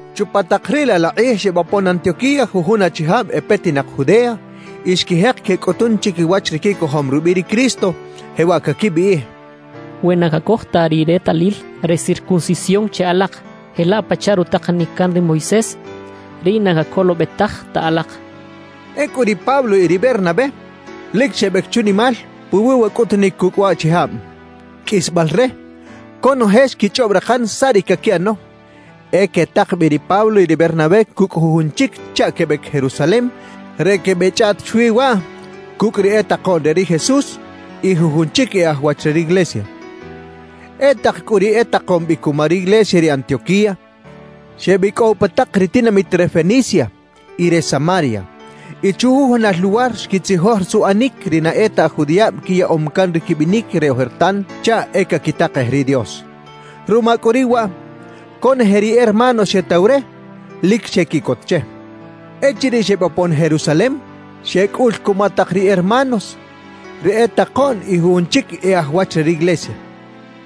Chupa tak riꞌ laꞌ la kꞌij xebopon Antioquía jujun achijab e petinak Judea y xquijek quecꞌutun chiquiwach ri quicojom rubiꞌ ri Cristo, jewaꞌ caquibiꞌij: «We na cacoj ta ri retalil re circuncisión che alak jelaꞌ pachaꞌ rutakanic can ri Moisés, riꞌ na cacolobetaj ta alak» quechaꞌ. Ecꞌu ri Pablo y ri Bernabé lic xebec chunimal puwi wa cꞌutunic cucꞌ waꞌchijab. Qꞌuisbal re, conoje xquichꞌob rakan saꞌ ri caquiꞌano; e quetak bi ri Pablo y ri Bernabé cucꞌ jujun chic chaꞌ quebec Jerusalem re quebeꞌchꞌaꞌt chwi waꞌ cucꞌ ri e takoꞌn re ri Jesús y jujun chic e aj wach re riglesia. E tak cꞌu ri etakom bi cuma riglesia re Antioquía, xebicꞌow pa tak ri tinamit re Fenicia y re Samaria, y chujujunal luwar xquitzijoj suꞌanic ri na e ta aj judiꞌab quiyaꞌom can ri quibinic re ojertan chaꞌ e caquitakej ri Dios. Ruma cꞌu riꞌ waꞌ, conoje ri hermanos xetaw re, lic xequiꞌcot che. Echiriꞌ xebopon Jerusalem, xecꞌul cuma tak ri hermanos, ri e takoꞌn y jujun chic e aj wach re riglesia.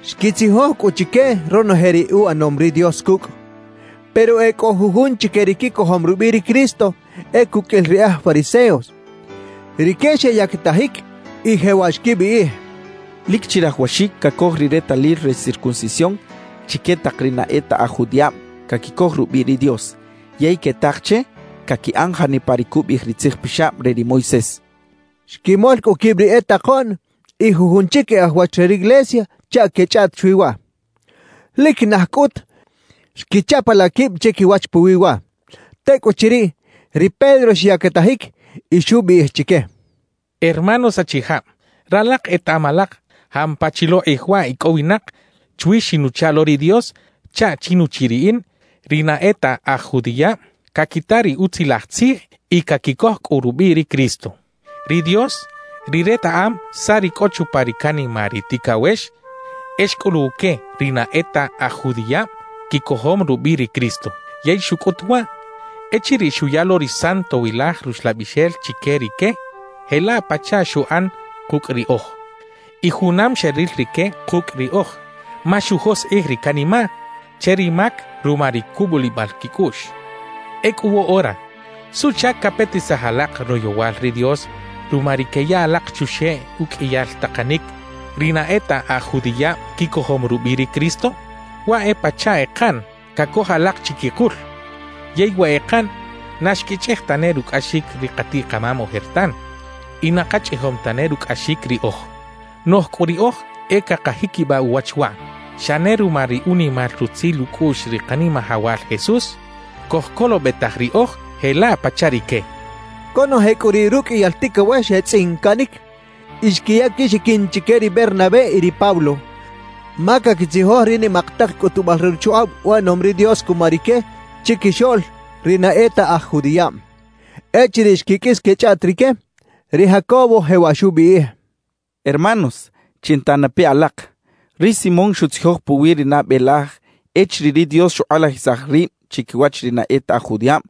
Xquitzijoj cꞌu chique ronoje ri uꞌanom ri Dios cucꞌ. Pero e cꞌo jujun chique ri quicojom rubiꞌ ri Cristo e cuqꞌuil ri aj fariseos, rique xeyactajic y jewaꞌ xquibiꞌij: —Lic chirajawaxic cacoj ri retalil re circuncisión chique tak ri na e ta aj judiꞌab caquicoj rubiꞌ ri Dios yey quetak che caquiꞌan janipa ri cubiꞌij ri Tzij Pixab re ri Moisés —xechaꞌ. Xquimol cꞌu quib ri e takoꞌn y jujun chic e aj wach re riglesia chaꞌ quechꞌaꞌt chwi waꞌ. Lic naj cꞌut xquichapalaꞌ quib chiquiwach puwi waꞌ. Tecꞌuchiriꞌ, ri Pedro xyactajic y xubiꞌij chique: —Hermanos achijab, ralak etaꞌam alak jampa chi lo kꞌij waꞌ icꞌowinak chwi xinuchaꞌ lo ri Dios chaꞌ chi nuchiꞌ riꞌin, ri na e ta aj judiꞌab caquita ri Utzilaj Tzij y caquicoj cꞌu rubiꞌ ri Cristo. Ri Dios, ri retaꞌam saꞌ ri cꞌo chupa ri canimaꞌ ri ticawex, e xcꞌuluw que ri na e ta aj judiꞌab quicojom rubiꞌ ri Cristo. Yey xucꞌut waꞌ echiriꞌ xuya lo ri Santowilaj Ruxlabixel chique rique jelaꞌ pachaꞌ xuꞌan kucꞌ riꞌoj. Y junam xeril rique kucꞌ riꞌoj, ma xujoskꞌij ri canimaꞌ che ri mac ruma ri cubulibal quicꞌuꞌx. »Ecꞌu woꞌora, ¿suꞌchac capetisaj alak royowal ri Dios ruma ri queya alak chuxeꞌ uqꞌuiyal takanic ri na e ta aj judiꞌab quicojom rubiꞌ ri Cristo? Waꞌ e pachaꞌ ekaꞌn cacoj alak chiquikul. Yey wa ekaꞌn, na xquichꞌij tane rucꞌaxic ri katiꞌ-kamam ojertan y na kachꞌijom tane rucꞌaxic riꞌoj. Noꞌj cꞌu riꞌoj e cakajiquibaꞌ uwach waꞌ: Xa ne ruma ri unimal rutzil ucꞌuꞌx ri Kanimajawal Jesús cojcolobetaj riꞌoj jelaꞌ pachaꞌ rique —xchaꞌ. Conoje cꞌu riꞌ ruqꞌuiyal ticawex xetzꞌincaꞌnic y xquiya quixiquin chique ri Bernabé y ri Pablo, ma caquitzijoj ri nimak tak cꞌutubal re chukꞌab uꞌanom ri Dios cuma rique chiquixoꞌl ri na e ta aj judiꞌab. Echiriꞌ xquiqꞌuis quechꞌaꞌt rique, ri Jacobo jewaꞌ xubiꞌij: —Hermanos, chinta na pe alak: Ri Simón xutzijoj puwi ri nabe laj echiriꞌ ri Dios xukꞌalajisaj rib chiquiwach ri na e ta aj judiꞌab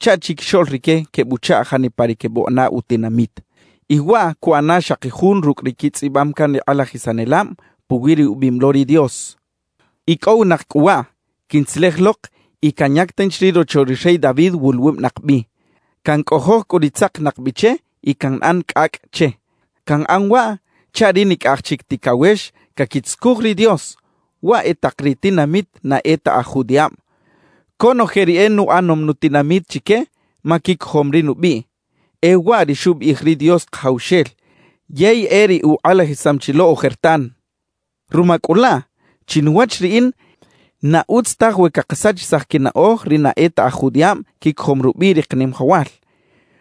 chaꞌ chiquixoꞌl rique quebuchaꞌ janipa ri quebuꞌana utinamit. Y waꞌ cuꞌana xaki jun rucꞌ ri quitzꞌibam can ri kꞌalajisanelab puwi ri ubiꞌim lo ri Dios: Icꞌowinak cꞌu waꞌ, quintzelej lok y canyac tanchi ri rocho ri rey David wuluwubinak bi, cancꞌojoj cꞌu ri tzakinak bi che y canꞌan cꞌacꞌ che. Canꞌan waꞌ chaꞌ ri nicꞌaj chic ticawex caquitzucuj ri Dios, waꞌ e tak ri tinamit na e ta aj judiꞌab, conoje ri e nuꞌanom nutinamit chique ma quicojom ri nubiꞌ. E waꞌ ri xubiꞌij ri Dios Kajawxel, yey e ri ukꞌalajisam chi lo ojertan. Ruma cꞌu laꞌ, chinuwach riꞌin na utz taj we cakasachisaj quinaꞌoj ri na e ta aj judiꞌab quicojom rubiꞌ ri Kanimajawal.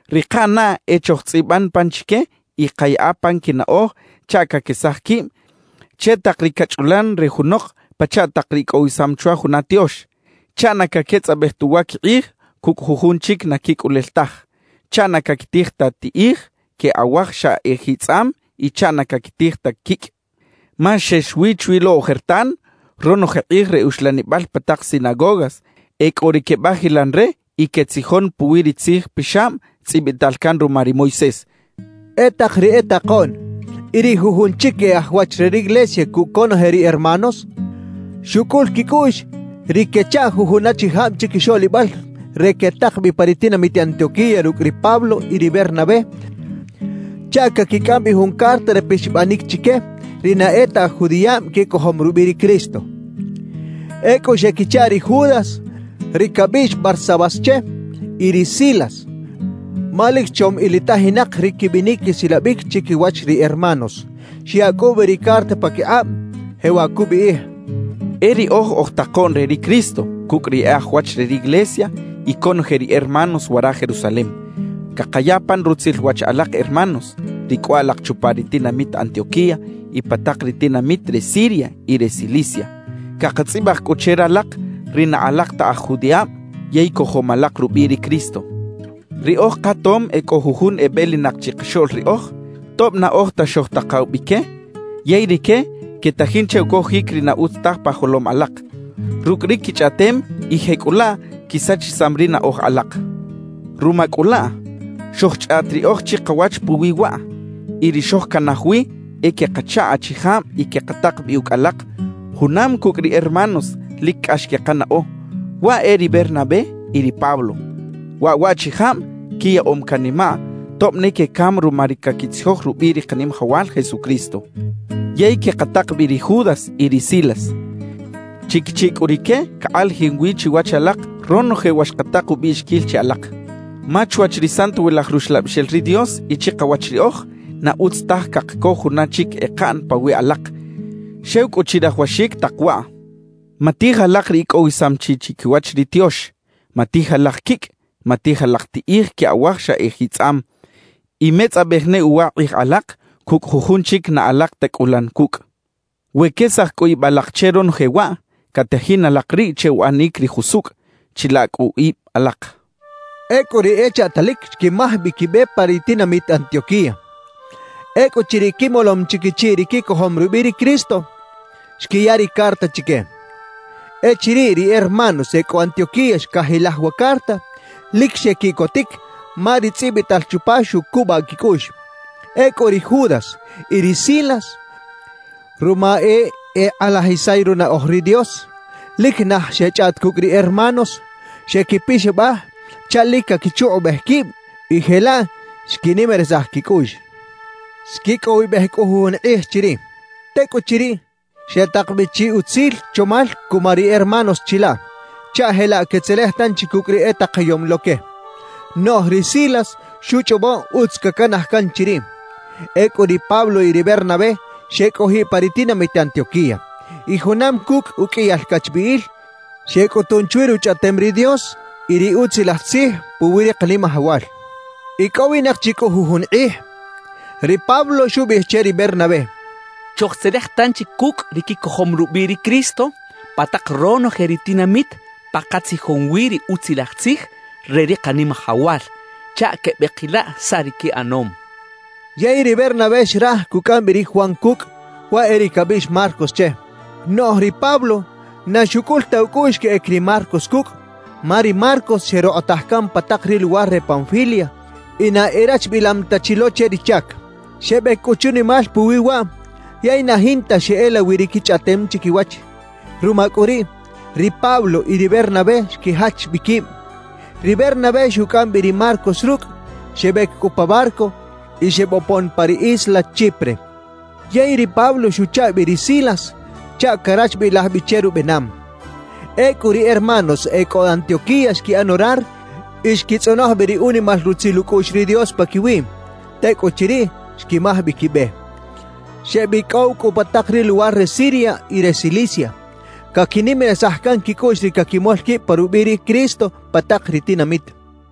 Ri kaꞌanaꞌ e chojtzꞌiban pan chique y kayaꞌa pan quinaꞌoj chaꞌ caquesaj quib che tak ri cachꞌulan re junok pachaꞌ tak ri icꞌowisam chwa juna tiox, chaꞌ na caquetzꞌabej ta uwa quikꞌij cucꞌ jujun chic na quicꞌulel taj, chaꞌ na caquitij ta tiꞌij que awaj xa ejitzꞌam y chaꞌ na caquitij ta quicꞌ. Ma xex wi chwi lo ojertan, ronoje kꞌij re uxlanibal pa tak sinagogas e cꞌo ri quebajilan re y quetzijon puwi ri Tzij Pixab tzꞌibital can ruma ri Moisés —xcha ri Jacobo. E tak ri e takoꞌn y ri jujun chic e aj wach re riglesia cucꞌ conoje ri hermanos, xucꞌul quicꞌuꞌx ri quechaꞌ jujun achijab chiquixoꞌlibal re quetak bi pa ri tinamit Antioquía rucꞌ ri Pablo y ri Bernabé chaꞌ caquicꞌam bi jun carta re pixabanic chique ri na e ta aj judiꞌab quicojom rubiꞌ ri Cristo. Ecꞌu xequichaꞌ ri Judas ri cabiꞌx Barsabás che y ri Silas, ma lic chom ilitajinak ri quibinic quisilabic chiquiwach ri hermanos. Xyaꞌ cꞌu bi ri carta paquikꞌab, jewaꞌ cubiꞌij: E riꞌoj oj takoꞌn re ri Cristo cucꞌ ri e aj wach re riglesia y conoje ri hermanos wara Jerusalem, cakaya pan rutzil wach alak hermanos, ri cꞌo alak chupa ri tinamit Antioquía y pa tak ri tinamit re Siria y re Cilicia. Cakatzꞌibaj cꞌu che ralak, ri na alak ta aj judiꞌab yey cojom alak rubiꞌ ri Cristo. Riꞌoj katom e cꞌo jujun ebelinak chikaxoꞌl riꞌoj, tob na oj ta xojtakaw bi que; yey rique quetajin che ucojic ri na utz taj pa jolom alak rucꞌ ri quichꞌaꞌtem y jecꞌulaꞌ quisachisam ri naꞌoj alak. Ruma cꞌu laꞌ, xojchꞌaꞌt riꞌoj chikawach puwi waꞌ, y ri xojcanaj wi e quekachaꞌ achijab y quekatak bi ucꞌ alak junam cucꞌ ri hermanos lic cꞌax quekanaꞌo, waꞌ e ri Bernabé y ri Pablo. Waꞌ waꞌchijab quiyaꞌom canimaꞌ tob ne quecam ruma ri caquitzijoj rubiꞌ ri Kanimajawal Jesucristo. Yey quekatak bi ri Judas y ri Silas. Chiquichiꞌ cꞌu rique cakꞌalajin wi chiwach alak ronoje wa xkatak ubiꞌxiquil che alak. Ma chwach ri Santowilaj Ruxlabixel ri Dios y chikawach riꞌoj, na utz taj cakacoj juna chic ekaꞌn pawiꞌ alak, xew cꞌu chirajawaxic tak waꞌ: Matij alak ri icꞌowisam chi chiquiwach ri tiox; matij alak quicꞌ, matij alak tiꞌij que awaj xa ejitzꞌam; y metzꞌabej ne uwa kꞌij alak cucꞌ jujun chic na alak ta cꞌulan cucꞌ. We quesaj cꞌu ib alak che ronoje waꞌ, catajin alak riꞌ che uꞌanic ri jusucꞌ. Chila cꞌu ib alak. Ecꞌu ri echaꞌtalic xquimaj bi quibe pa ri tinamit Antioquía. Ecꞌuchiriꞌ quimolom chi quichiꞌ ri quicojom rubiꞌ ri Cristo, xquiya ri carta chique. Echiriꞌ ri hermanos e cꞌo Antioquía xcajilaj wa carta, lic xequiꞌcotic ma ri tzꞌibital chupa xucubaꞌ quicꞌuꞌx. Ecꞌu ri Judas y ri Silas, ruma e ekꞌalajisay runaꞌoj ri Dios, lic naj xechꞌaꞌt cucꞌ ri hermanos, xequipixabaj chaꞌ lic caquichukꞌubej quib y jelaꞌ xquinimarisaj quicꞌuꞌx. Xquicꞌowibej cꞌu jujun kꞌij chiriꞌ. Tecꞌuchiriꞌ, xetak bi chi utzil chomal cuma ri hermanos chilaꞌ, chaꞌ jelaꞌ quetzelej tanchi cucꞌ ri etakayom lo que. Noꞌj ri Silas xuchꞌobo utz cacanaj can chiriꞌ. Ecꞌu ri Pablo y ri Bernabé xecꞌojiꞌ pa ri tinamit Antioquía. Y junam cucꞌ uqꞌuiyal cachbiꞌil, xecꞌutun chwi Ruchꞌaꞌtem ri Dios y ri Utzilaj Tzij puwi ri Kanimajawal. Icꞌowinak chi cꞌu jujun kꞌij, ri Pablo xubiꞌij che ri Bernabé: «Chojtzelej tanchi cucꞌ ri quicojom rubiꞌ ri Cristo pa tak ronoje ri tinamit pa katzijom wi ri Utzilaj Tzij re ri Kanimajawal, chaꞌ quebeꞌkilaꞌ saꞌ ri quiꞌanom» xchaꞌ. Yey ri Bernabé xraj cucꞌam bi ri Juan cucꞌ, waꞌ e ri cabiꞌx Marcos che. Noꞌj ri Pablo na xucꞌul ta ucꞌuꞌx queꞌec ri Marcos cucꞌ, ma ri Marcos xerokꞌotaj can pa tak ri luwar re Panfilia y na erachbilam ta chi lo che ri chac. Xebec cꞌu chunimal puwi waꞌ yey na jinta xeꞌela wi ri quichꞌaꞌtem chiquiwach. Ruma cꞌu riꞌ, ri Pablo y ri Bernabé xquijach bi quib. Ri Bernabé xucꞌam bi ri Marcos rucꞌ. Xebec cꞌu pa barco y xebopon pa ri isla Chipre. Yey ri Pablo xuchaꞌ bi ri Silas chaꞌ carachbilaj bi che rubenam. Ecꞌu ri hermanos e cꞌo Antioquía xquiꞌan orar y xquitzꞌonoj bi ri unimal rutzil ucꞌuꞌx ri Dios paquiwiꞌ; tecꞌuchiriꞌ, xquimaj bi quibe. Xebicꞌow cꞌu pa tak ri luwar re Siria y re Cilicia, caquinimarisaj can quicꞌuꞌx ri caquimol quib pa rubiꞌ ri Cristo pa tak ri tinamit.